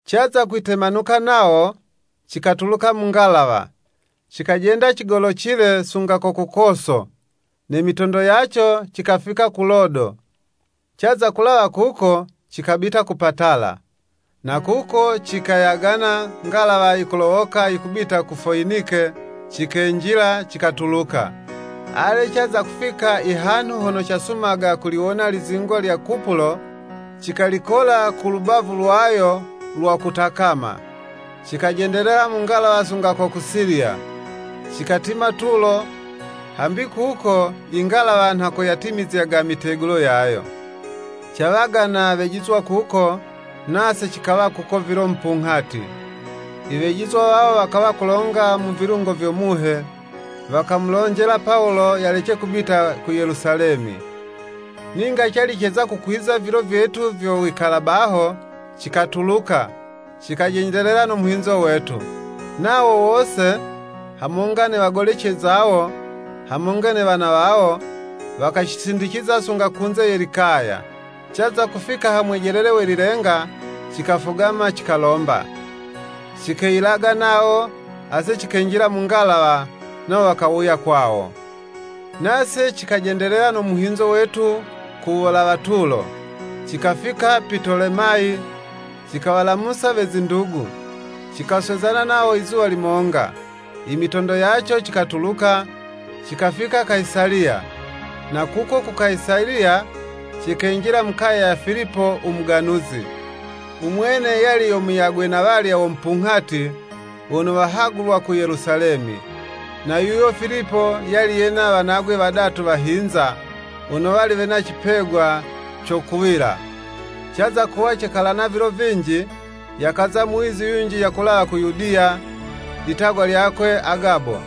Caza kwitemanuka nawo, cikatuluka mu ngalawa, cikajenda cigolocile sunga ko ku Koso, ne mitondo yaco cikafika ku Lodo, caza kulawa kuko cikabita ku Patala. Na kuko cikayagana ngalawa yikulowoka yikubita ku Foyinike, cikenjila, cikatuluka. Ale caza kufika i hanhu hono casumaga kuliwona lizingwa lya Kupulo, cikalikola ku lubavu lwayo lwa kutakama, cikajendelela mu ngalawa sunga ko ku Siliya, cikatimila Tulo, hambi kuko ingalawa nha ko yatimizyaga mitegulo yayo. Cawagana wejizwa kuko, nase cikawa kuko vilo mupunghati. Iwejizwa wawo wakawa kulonga mu vilungo vyo Muhe, wakamulonjela Pawulo, yalece kubita ku Yelusalemi. Ninga cali ceza kukwiza vilo vyetu vyo wikala baho, cikatuluka, cikajendelela no muhinzo wetu. Nawo wose, hamonga ne wagolece zawo, hamonga ne wana wawo, wakacisindiciza sunga kunze ye likaya. Caza kufika ha mwejelele we lilenga, cikafugama, cikalomba. Cikeyilaga nawo, ase cikenjila mu ngalawa, nawo wakawuya kwawo. Nase cikajendelela no muhinzo wetu ku wulawa Tulo, cikafika Pitolemayi, cikawalamusa we zindugu, cikaswezana nawo izuwa limonga. Imitondo yaco cikatuluka, cikafika Kayisaliya. Na kuko ku Kayisaliya, cikenjila mu kaya ya Filipo u muganuzi. Umwene yali yo muyagwe na walya wo mupunghati, wono wahagulwa ku Yelusalemi. Na yuyo Filipo, yali yena wanagwe wadatu wahinza, wono wali wena cipegwa co kuwila. Caza kuwa cekalakala vilo vinji, yakaza muwizi yunji yakulawa ku Yudiya, litagwa lyakwe Agabo.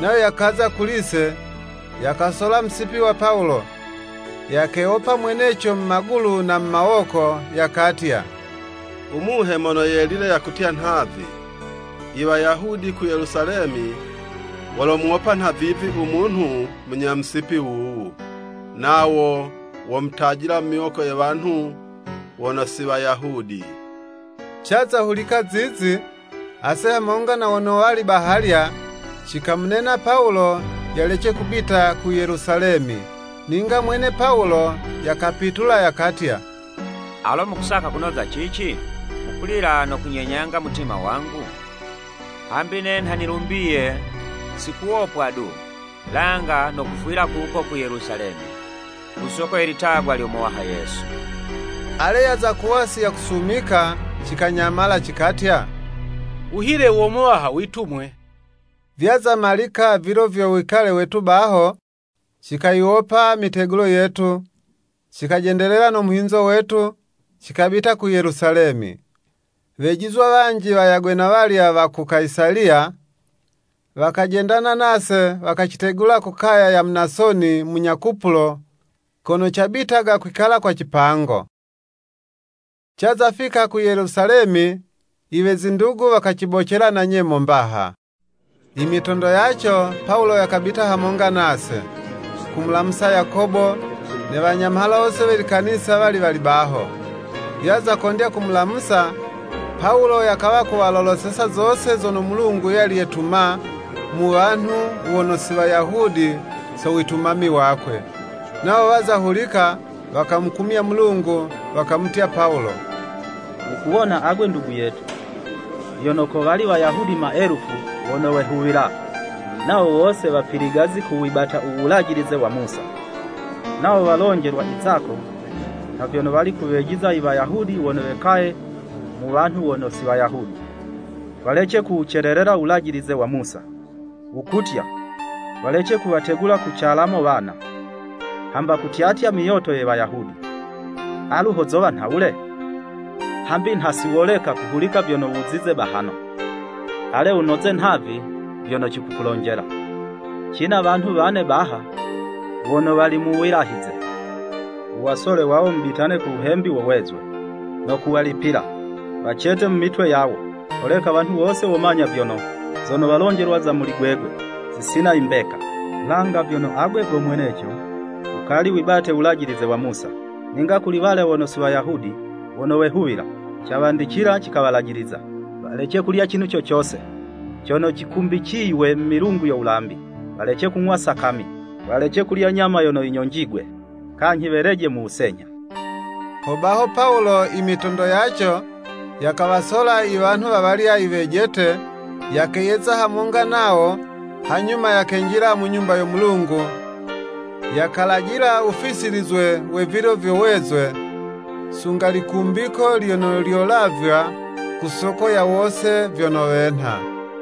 Nayo yakaza kuli'se, yakasola musipi wa Pawulo, yakewopa mweneco mu magulu na mu mawoko, yakatya, “U Muhe Mono Yelile yakutya nhavi, Iwayahudi ku Yelusalemi wolomuwopa nhavivi u munhu munya musipi wuwu, nawo womutajila mu miwoko ye wanhu wono si Wayahudi!” Caza hulika zizi, ase hamonga na wono wali bahalya, cikamunena Pawulo yalece kubita ku Yelusalemi. Ninga mwene Pawulo yakapitula yakatya, “Alo mukusaka kunoza cici? Mukulila no kunyenyanga mutima wangu? Hambi ne nha nilumbiye si kuwopwa du, langa no kufwila kuko ku Yelusalemi, ku soko ye litagwa lyo Muwaha Yesu.” Ale yaza kuwa si yakusumika, cikanyamala, cikatya, “Wuhile wo Muwaha witumwe.” Vyaza malika vilo vyo wikale wetu baho, cikayiwopa mitegulo yetu, cikajendelela no muhinzo wetu, cikabita ku Yelusalemi. Wejizwa wanji wayagwe na walya wa ku Kayisaliya, wakajendana nase wakacitegula ku kaya ya Munasoni, munya Kupulo, kono cabitaga kwikala kwa cipango. Caza fika ku Yelusalemi iwe zindugu wakacibocela na nyemo mbaha. Imitondo yaco Pawulo yakabita hamonga nase, kumulamusa Yakobo, ne Wanyamhala wose we likanisa wali wali baho. Yaza kondya kuwalamusa, Pawulo yakawa kuwaloloseza zose zono Mulungu yali yetuma mu wanhu wono si Wayahudi so witumami wakwe. Nawo waza hulika wakamukumya Mulungu, wakamutya Pawulo, “Wukuwona agwe ndugu yetu, vyono kowali Wayahudi maelufu, wono wehuwila, nawo wose wapiligazi ku wibata u Wulajilize wa Musa. Nawo walonjelwa i zako, nha vyono wali kuwejiza i Wayahudi wono wekaye mu wanhu wono si Wayahudi, walece kuwucelelela Wulajilize wa Musa, wukutya, walece kuwategula ku calamo wana, hamba kutyatya myoto ye Wayahudi. Alu ho zowa nhawule? Hambi nha si woleka kuhulika vyono wuzize bahano. Ale wunoze nhavi vyono cikukulonjela, cina wanhu wane baha, wono wali mu wilahize, wuwasole wawo mubitane ku wuhembi wo wezwe, no kuwalipila, wacete mu mitwe yawo, holeka wanhu wose womanya vyono, zono walonjelwa za muli gwegwe zisina imbeka, langa vyono agwe go mweneco wukali wibate Wulajilize wa Musa. Ninga kuli walya wono si Wayahudi wono wehuwila, cawandicila, cikawalajiliza, Walece kulya cinhu co cose cono cikumbiciywe milungu yo wulambi, walece kung'wa sakami, walece kulya nyama yono yinyonjigwe, kanyhi weleje mu wusenyha.” Hobaho Pawulo, imitondo yaco yakawasola i wanhu wa walya iwejete, yakeyeza hamonga nawo, hanyuma yakenjila mu Nyumba yo Mulungu, yakalajila wufisilizwe we vilo vyo wezwe, sunga likumbiko lyono lyolavywa ku soko ya wose vyono wenha.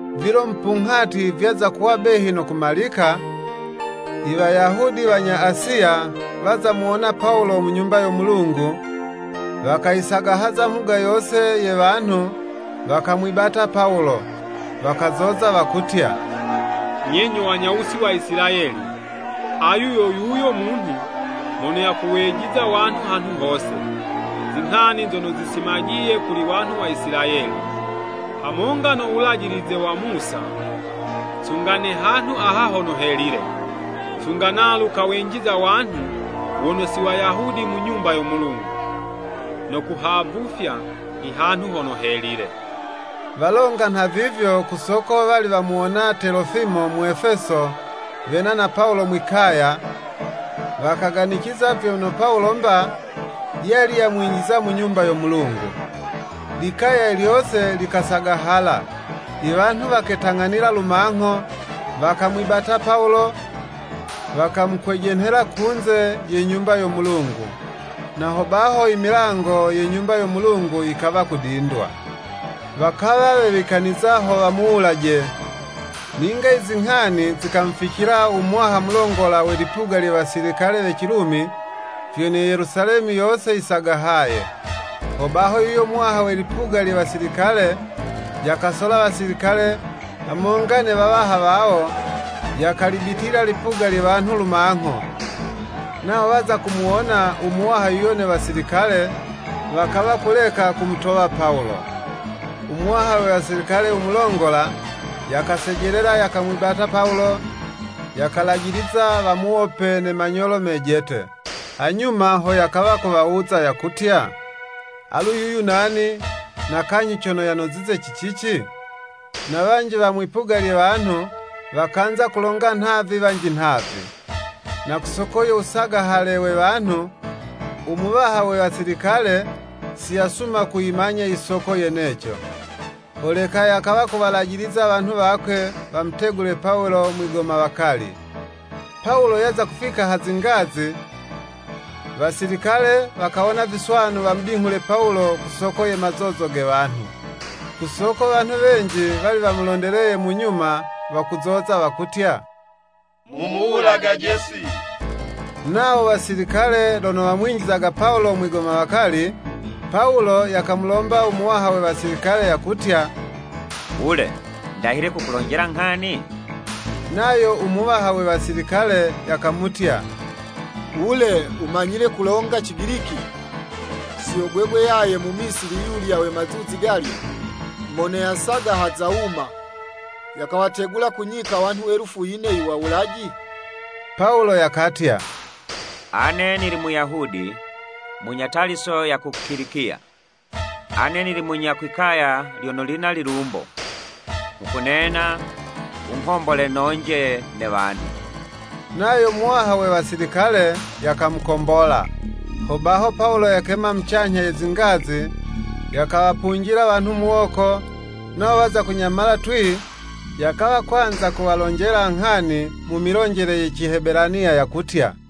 Vilo mupunghati vyaza kuwa behi no kumalika, Iwayahudi wanya Asiya waza muwona Pawulo mu Nyumba yo Mulungu. Wakayisagahaza mhuga yose ye wanhu, wakamwibata Pawulo. Wakazoza, wakutya, “Nye nyo wanyawusi wa Isilayeli, Ayu yo yuyo munhu, mono yakuwejiza wanhu hanhu hose, zinghani zono zisimajiye kuli wanhu wa Isilayeli, hamonga no Wulajilize wa Musa, sunga ne hanhu aha hono Helile, sunga nalu kawenjiza wanhu wono si Wayahudi mu Nyumba yo Mulungu, no kuhavufya ihanhu hono Helile.” Walonga nha vivyo ku soko wali wamuwona Telofimo Mwefeso wena na Pawulo mwi'kaya, wakaganiciza vyono Pawulo 'mba, yali yamwinjiza mu Nyumba yo Mulungu. Likaya lyose likasagahala, iwanhu waketang'anila lumangho, wakamwibata Pawulo, wakamukwejenhela kunze ye Nyumba yo Mulungu, na ho baho imilango ye Nyumba yo Mulungu yikawa kudindwa. Wakawa wewikaniza ho wamuwulaje, ninga izinghani zikamuficila u muwaha mulongola we lipuga lye wasilikale we Cilumi, vyono Yelusalemi yose yisagahaye. Hobaho yuyo muwaha we lipuga lye wasilikale, yakasola wasilikale, hamonga ne wawaha wawo, yakalibitila lipuga lye wanhu lumangho, nawo waza kumuwona u muwaha yuyo ne wasilikale, wakawa kuleka kumutowa Pawulo. U muwaha we wasilikale u mulongola, yakasejelela, yakamwibata Pawulo, yakalajiliza wamuwope ne manyolo mejete. Hanyuma ho yakawa kuwawuza, yakutya, “Alu yuyu nani, na kanyhi cono yanozize ci cici?” Na wanji wa mwi'puga lye wanhu, wakanza kulonga nhavi wanji nhavi. Na ku soko yo wusagahale we wanhu, umuwaha we wasilikale si yasuma kuyimanya i soko yeneco. Holeka yakawa kuwalajiliza wanhu wakwe wamutegule Pawulo mwigomawakali. Pawulo yaza kufika ha zingazi, wasilikale wakawona viswanu wamudinghule Pawulo ku soko ye mazozo ge wanhu. Ku soko wanhu wenji wali wamulondeleye mu nyuma, wakuzoza, wakutya, “Mumuwulagaje si.” Nawo wasilikale lono wamwinjizaga Pawulo mwigomawakali, Pawulo yakamulomba u muwaha we wasilikale, yakutya, “Wule, ndahile kukulonjela nghani?” Nayo u muwaha we wasilikale yakamutya, “Wule, wumanyile kulonga Cigiliki? Si yo gwegwe yaye Mumisili yulya we mazuzi galya, mono yasagahaza wuma, yakawategula ku nyika wanhu elufu yine i wawulaji?” Pawulo yakatya, “Ane nili Muyahudi, munya Taliso ya ku Kilikiya, ane nili munya kwi'kaya lyono lina lilumbo. Nghukunena wunghombole nonje ne wanhu.” Nayo muwaha we wasilikale, yakamukombola. Hobaho Pawulo yakema mucanyha ye zingazi yakawapunjila wanhu muwoko, nawo waza kunyamala twii, yakawa kwanza kuwalonjela nghani mu milonjele ye Cihebelaniya, yakutya.